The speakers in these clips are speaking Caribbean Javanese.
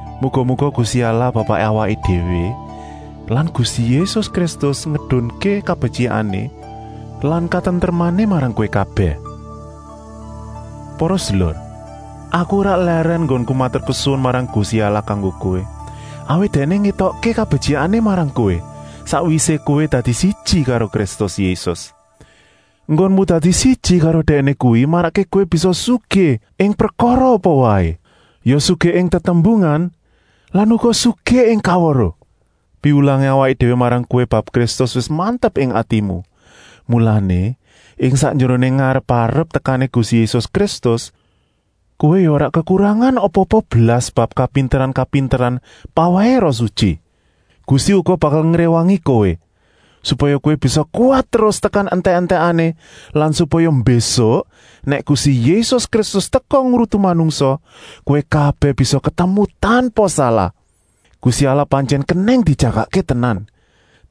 Muga-muga Gusti Allah Bapaké awaké déwé lan Gusti Yésus Kristus ngedunké kabetyikané lan katentremané marang kowé kabèh. Para sedulur, aku ora lèrèn enggonku maturkesuwun marang Gusti Allah kanggo kowé, awit Dèkné ngétokké kabetyikané marang kowé, sakwisé kowé dadi siji karo Kristus Yésus. Enggonmu dadi siji karo Dèkné kuwi marakké kowé bisa sugih ing prekara apa waé, ya sugih ing tetembungan lan uga sugih ing kaweruh. Piwulangé awaké déwé marang kowé bab Kristus wis mantep ing atimu, mulané, ing sakjeroné ngarep-arep tekané Gusti Yésus Kristus kowé ya ora kekurangan apa-apa blas bab kapinteran-kapinteran pawèhé Roh Sutyi. Gusti uga bakal ngréwangi kowé, supaya kowé bisa kuwat terus tekan entèk-entèkané lan supaya mbésuk, nèk Gusti Yésus Kristus teka ngrutu manungsa, kowé kabèh bisa ketemu tanpa salah. Gusti Allah pantyèn kenèng dijagakké tenan.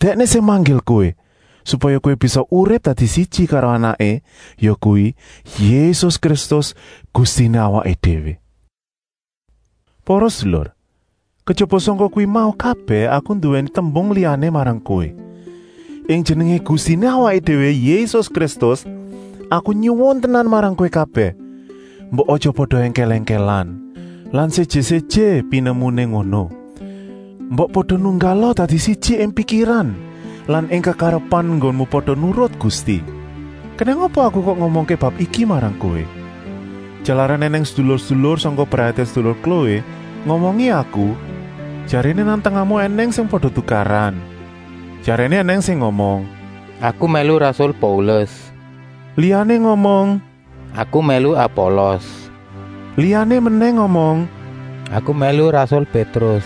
Dèkné sing manggil kowé, supaya kowé bisa urip dadi siji karo Anaké, yakuwi, Yésus Kristus, Gustiné awaké déwé. Para sedulur, kejaba sangka kuwi mau kabèh aku nduwèni tembung liyané marang kowé! Ing Jenengé Gustiné awaké déwé Yésus Kristus aku nyuwun tenan marang kowé kabèh, mbok aja pada èngkèl-èngkèlan lan séjé-séjé pinemuné ngono. Mbok pada nunggala dadi siji ing pikiran lan ing kekarepan enggonmu pada nurut Gusti. Kenèng apa aku kok ngomongké bab iki marang kowé? Jalaran ènèng sedulur-sedulur sangka brayaté sedulur Kloé ngomongi aku, jaréné nang tengahmu ènèng sing pada tukaran. Jaréné ènèng sing ngomong: “Aku mèlu rasul Paulus,” liyané ngomong: “Aku mèlu Apolos,” liyané menèh ngomong: “Aku mèlu rasul Pétrus”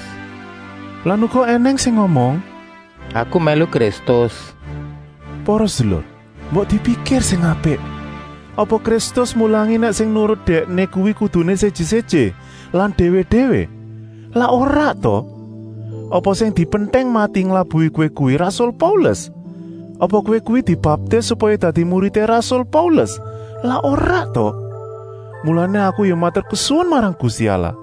lan uga ènèng sing ngomong: “Aku mèlu Kristus.” Para sedulur, mbok dipikir sing apik! Apa Kristus mulangi nèk sing nurut Dèkné kuwi kuduné séjé-séjé lan déwé-déwé? Lak ora ta? Apa sing dipentèng mati nglabuhi kowé kuwi rasul Paulus? Apa kowé kuwi dibaptis supaya dadi muridé rasul Paulus? Lak ora ta? Mulané aku ya maturkesuwun marang Gusti Allah,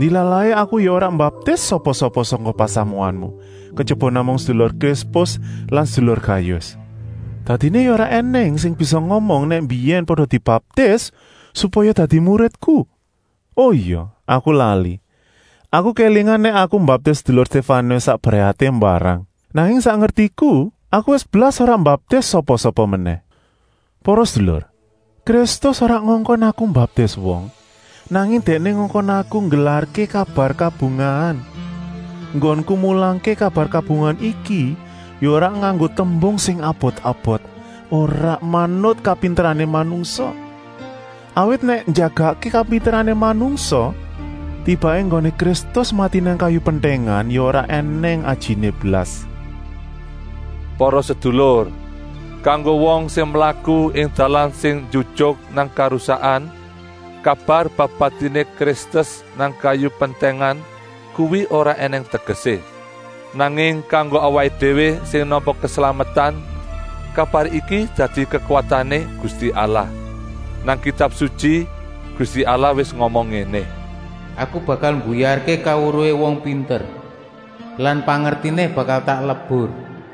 ndilalahé aku ya ora mbaptis sapa-sapa sangka pasamuanmu, kejaba namung sedulur Krispus lan sedulur Gayus. Dadiné ya ora ènèng sing bisa ngomong nèk mbiyèn pada dibaptis supaya dadi muridku. O ya, aku lali, aku kélingan nèk aku mbaptis sedulur Stéfanus sak brayaté mbarang. Nanging sak ngertiku aku wis blas ora mbaptis sapa-sapa menèh. Para sedulur, Kristus ora ngongkon aku mbaptis wong, nanging Dèkné ngongkon aku nggelarké kabar kabungahan. Enggonku mulangké kabar kabungahan iki ya ora nganggo tembung sing abot-abot, ora manut kapinterané manungsa. Awit nèk njagakké kapinterané manungsa, tibaké enggoné Kristus mati nang kayu pentèngan ya ora ènèng ajiné blas. Para sedulur, kanggo wong sing mlaku ing dalan sing njujuk nang karusakan kabar bab patiné Kristus nang kayu pentèngan kuwi ora ènèng tegesé. Nanging kanggo awaké déwé sing nampa keslametan, kabar iki dadi kekuwatané Gusti Allah. Nang Kitab Sutyi Gusti Allah wis ngomong ngéné: “Aku bakal mbuyarké kaweruhé wong pinter lan pangertiné bakal tak lebur.”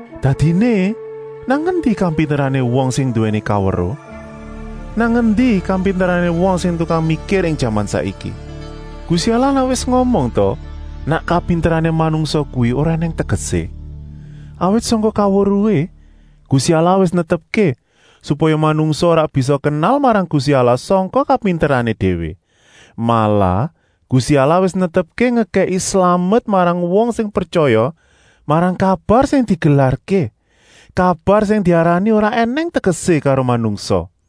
Dadiné, nang endi kapinterané wong sing nduwèni kaweruh? Nang endi kapinterané sing tukang mikir ing jaman saiki? Gusti Allah lak wis ngomong ta nèk kapinterané manungsa kuwi ora ènèng tegesé. Awit sangka kaweruhé, Gusti Allah wis netepké, supaya manungsa ora bisa kenal marang Gusti Allah sangka kapinterané déwé. Malah, Gusti Allah wis netepké ngekèki slamet marang wong sing pretyaya marang kabar sing digelarké, kabar sing diarani ora ènèng tegesé karo manungsa.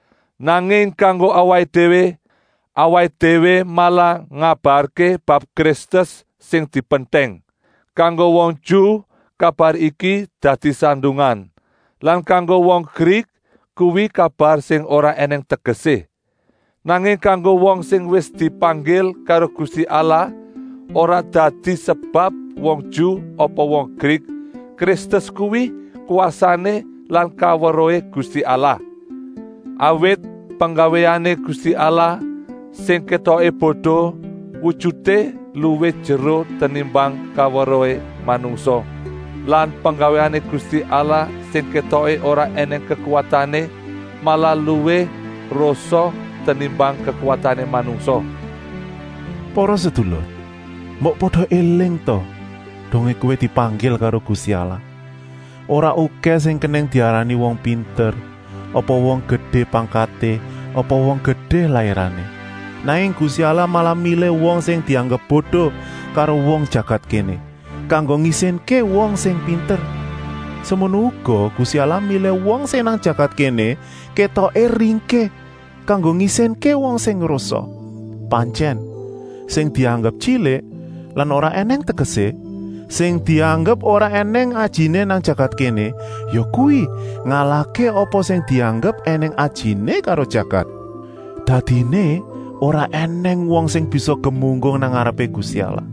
Nanging kanggo awaké déwé, awaké déwé malah ngabarké bab Kristus sing dipentèng. Kanggo wong Ju kabar iki dadi sandungan lan kanggo wong Grik kuwi kabar sing ora ènèng tegesé. Nanging kanggo wong sing wis dipanggil karo Gusti Allah ora dadi sebab wong Ju apa wong Grik, Kristus kuwi kwasané lan kaweruhé Gusti Allah. Awit penggawéané Gusti Allah, sing kétoké bodo, wujuté luwih jeru tenimbang kaweruhé manungsa lan penggawéané Gusti Allah sing kétoké ora ènèng kekuwatané, malah luwih rosa tenimbang kekuwatané manungsa. Para sedulur, mbok pada éling ta dongé kowé dipanggil karo Gusti Allah. Ora okèh sing kenèng diarani wong pinter apa wong gedé pangkaté apa wong gedé lairané Nanging Gusti Allah malah milih wong sing dianggep bodo karo wong jagat kéné, kanggo ngisinké wong sing pinter. Semono uga Gusti Allah milih wong sing nang jagat kéné kétoké ringkih, kanggo ngisinké wong sing rosa. Pantyèn, sing dianggep tyilik lan ora ènèng tegesé, sing dianggep ora ènèng ajiné nang jagat kéné, yakuwi ngalahké apa sing dianggep ènèng ajiné karo jagat. Dadiné ora ènèng wong sing bisa gemunggung nang ngarepé Gusti Allah.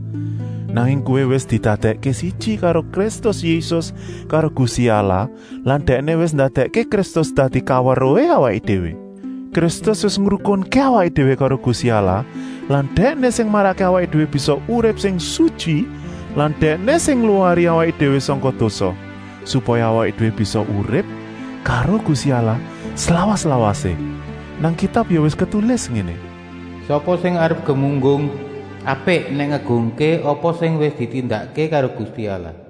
Nanging kowé wis didadèkké siji karo Kristus Yésus karo Gusti Allah lan Dèkné wis ndadèkké Kristus dadi kaweruhé awaké déwé. Kristus wis ngrukunké awaké déwé karo Gusti Allah lan Dèkné sing marakké awaké déwé bisa urip sing sutyi lan Dèkné sing ngluwari awaké déwé sangka dosa, supaya awaké déwé bisa urip karo Gusti Allah slawas-lawasé. Nang Kitab ya wis ketulis ngéné: “Sapa sing arep gemunggung, apik nèk ngegungké apa sing wis ditindakké karo Gusti Allah.”